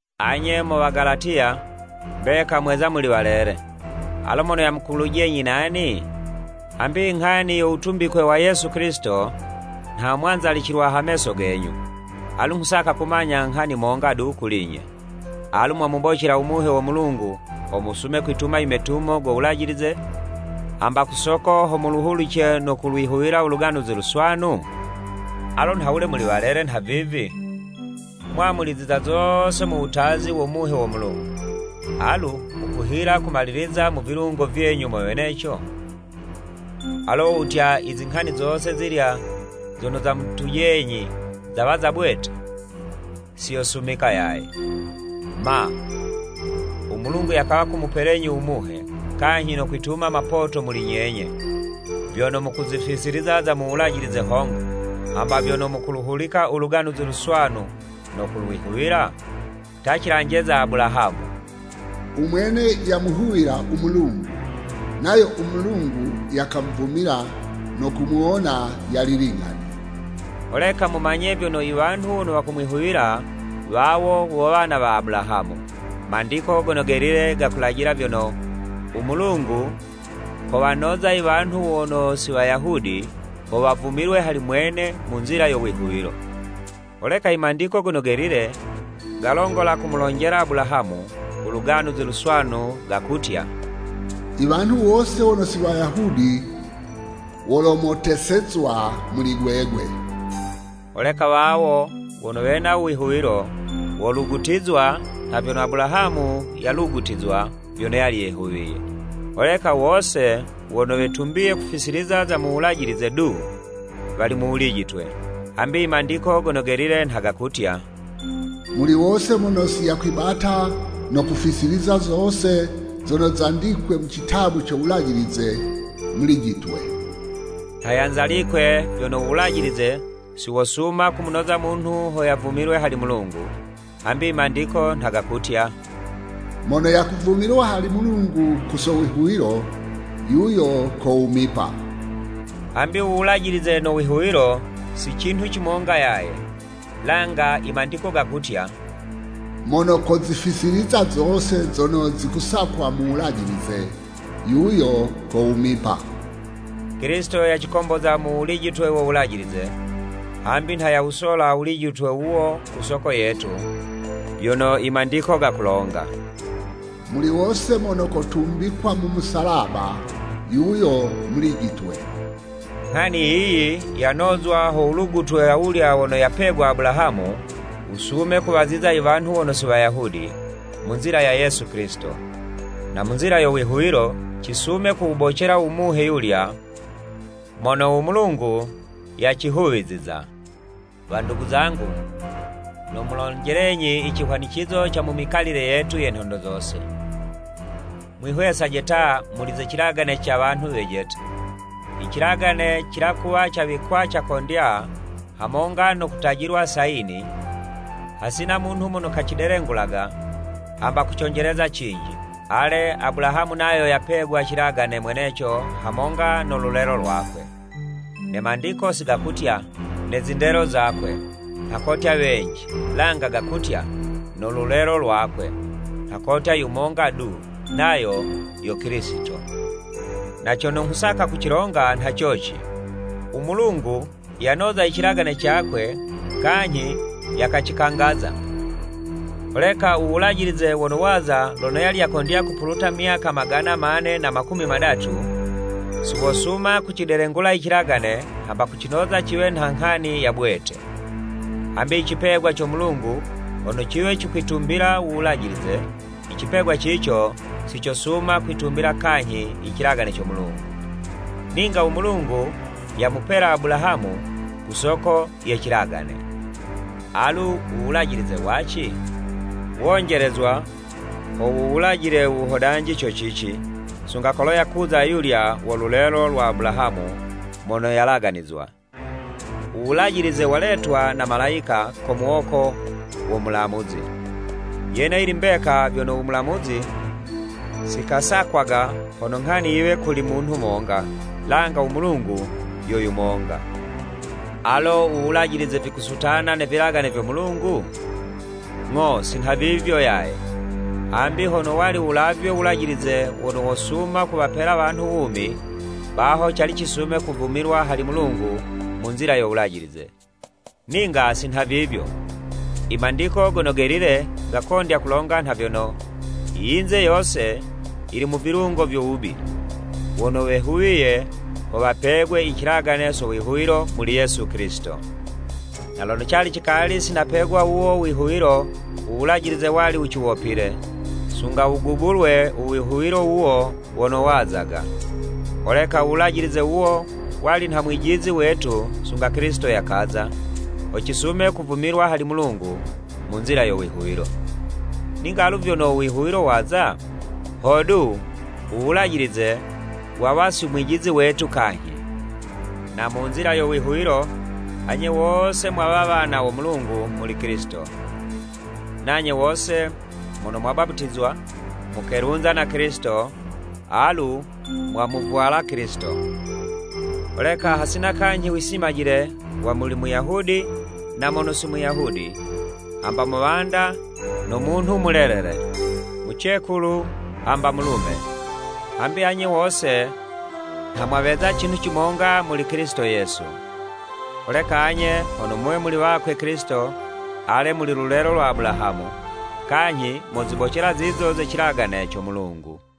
Anye mo Wagalatiya, mbeka mweza muli walele! Alo mono yamukulujenyi nani? Hamby inghani yo wutumbikwe wa Yesu Kilisito, nha mwanzalicilwa ha meso genyu. Alu nghusaka kumanya nghani monga du kuli'nye. Alu mwamubocela u Muhe wo Mulungu ho musume kwituma i metumo go Wulajilize, hamba ku soko ho muluhulice no kulwihuwila u Luganuzi Luswanu? Alo nha wule muli walele nhavivi? Mwamuliziza zose mu wutazi wo Muhe wo Mulungu, alu mukuhila kumaliliziza mu vilungo vyenyu mo weneco? Alo wo wutya, i zinghani zose zilya zono zamutujenyi zawa za bwete? Si yosumika yaye! Ma, u Mulungu, yakawa kumupelenyi u Muhe kanyhi no kwituma mapoto muli nyenye, vyono mukuzifisiliza za mu Wulajilize hongo, hamba vyono mukuluhulika u Luganuzi Luswanu no kulwihuwila? Ta, cilanje za Abulahamu; u mwene yamwihuwila u Mulungu, nayo u Mulungu yakamuvumila no kumuwona yali ling'ani. Holeka mumanye vyono i wanhu wono wakumwihuwila, wawo wo wana wa Abulahamu. I Mandiko Gono Gelile gakulajila vyono, u Mulungu kowanoza i wanhu wono si Wayahudi ho wavumilwe hali mwene mu nzila yo wihuwilo. Holeka i Mandiko Gono Gelile galongola kumulonjela Abulahamu u Luganuzi Luswanu gakutya, “I wanhu wose wono si Wayahudi wolomotesezwa muli gwegwe.” Holeka wawo wono wena u wihuwilo, wolugutizwa nha vyono Abulahamu yalugutizwa vyono yali yehuwiye. Holeka wose wono wetumbiye kufisiliza za mu Wulajilize du, wali mu wulijitwe, hambi i Mandiko Gono Gelile nha gakutya, “Muli wose mono si yakwibata no kufisiliza zose zono zandikwe mu citabu co Wulajilize, mulijitwe.” Nha yanzalikwe, vyono u Wulajilize si wosuma kumunoza munhu ho yavumilwe hali Mulungu, hambi i Mandiko nha gakutya, “Mono yakuvumilwa hali Mulungu ku so wihuwilo, yuyo kowumipa.” Hambi u Wulajilize no wihuwilo, siyo cinhu cimonga yaye, langa i Mandiko gakutya, “Mono kozifisiliza zose zono zikusakwa mu Wulajilize, yuyo kowumipa.” Kilisito yacikomboza mu wulijitwe wo Wulajilize, hambi nha yawusola u wulijitwe wuwo ku soko yetu, vyono i Mandiko gakulonga, “Muli wose mono kotumbikwa mu musalaba, yuyo mulijitwe.” Nghani yiyi yanozwa ho wulugutwe awulya wono yapegwa Abulahamu, wusume kuwaziza i wanhu wono si Wayahudi mu nzila ya Yesu Kilisito, na mu nzila yo wihuwilo, cisume kuwubocela u Muhe yulya mono u Mulungu yacihuwiziza. Wandugu zangu, nomulonjelenyi i cihwanicizo ca mu mikalile yetu ye nhondo zose. Mwihwesaje ta muli ze cilagane ca wanhu wejete. I cilagane cila kuwa cawikwa cakondya, hamonga no kutajilwa sayini, hasina munhu mono kacidelengulaga, hamba kuconjeleza cinji. Ale Abulahamu nayo yapegwa cilagane mweneco hamonga no lulelo lwakwe. Ne Mandiko si gakutya, “Ne zindelo zakwe.” Nha kotya wenji, langa gakutya “No lulelo lwakwe” nha kotya yumonga du nayo yo Kilisito. Na cono nghusaka kucilonga nha coci, u Mulungu yanoza i cilagane cakwe kanyhi yakacikangaza, holeka u Wulajilize wono waza lono yali yakondya kupuluta myaka magana mane na makumi madatu, si wosuma kucidelengula i cilagane hamba kucinoza ciwe nha nghani ya bwete. Hambi i cipegwa co Mulungu hono ciwe cikwitumbila u Wulajilize, i cipegwa cico si cosuma kwitumbila kanyhi i cilagane co Mulungu. Ninga u Mulungu yamupela Abulahamu ku soko ye cilagane. Alu u Wulajilize waci? Wonjelezwa ho wuwulajile u wuhodanji co cici, sunga kolo yakuza ayulya wo lulelo lwa Abulahamu mono yalaganizwa. U Wulajilize waletwa na malayika ko muwoko wo mulamuzi. Yene yili mbeka vyono u mulamuzi si kasakwaga hono nghani yiwe kuli munhu monga, langa u Mulungu yo yumonga. Alo u Wulajilize vikusutana ne vilagane vyo Mulungu? Ng'o si nhavivyo yaye! Hambi hono wali wulavywe Wulajilize wono wosuma kuwapela wanhu wumi, baho cali cisume kuvumilwa hali Mulungu mu nzila yo Wulajilize. Ninga si nhavivyo, i Mandiko Gono Gelile gakondya kulonga nha vyono, i yinze yose yili mu vilungo vyo wubi, wono wehuwiye ho wapegwe i cilagane so wihuwilo muli Yesu Kilisito. Na lono cali cikali si napegwa wuwo u wihuwilo, u Wulajilize wali wuciwopile, sunga wugubulwe u wihuwilo wuwo wono wazaga. Holeka u Wulajilize wuwo wali nha mwijizi wetu sunga Kilisito yakaza, ho cisume kuvumilwa hali Mulungu mu nzila yo wihuwilo. Ninga alu vyono u wihuwilo waza, hodu, u Wulajilize wawa si mwijizi wetu kanyhi. Na mu nzila yo wihuwilo, anye wose mwawa wana wo Mulungu muli Kilisito. Nanye wose mono mwabaputizwa, mukelunza na Kilisito, alu mwamuvwala Kilisito. Holeka hasina kanyhi wisimajile wa muli Muyahudi na mono si Muyahudi, hamba muwanda no munhu mulelele, mucekulu hamba mulume. Hambi anye wose nha mwaweza cinhu cimonga muli Kilisito Yesu. Holeka anye hono muwe muli wakwe Kilisito, ale muli lulelo lwa Abulahamu, kanyhi mozibocela zizo ze cilagane co Mulungu.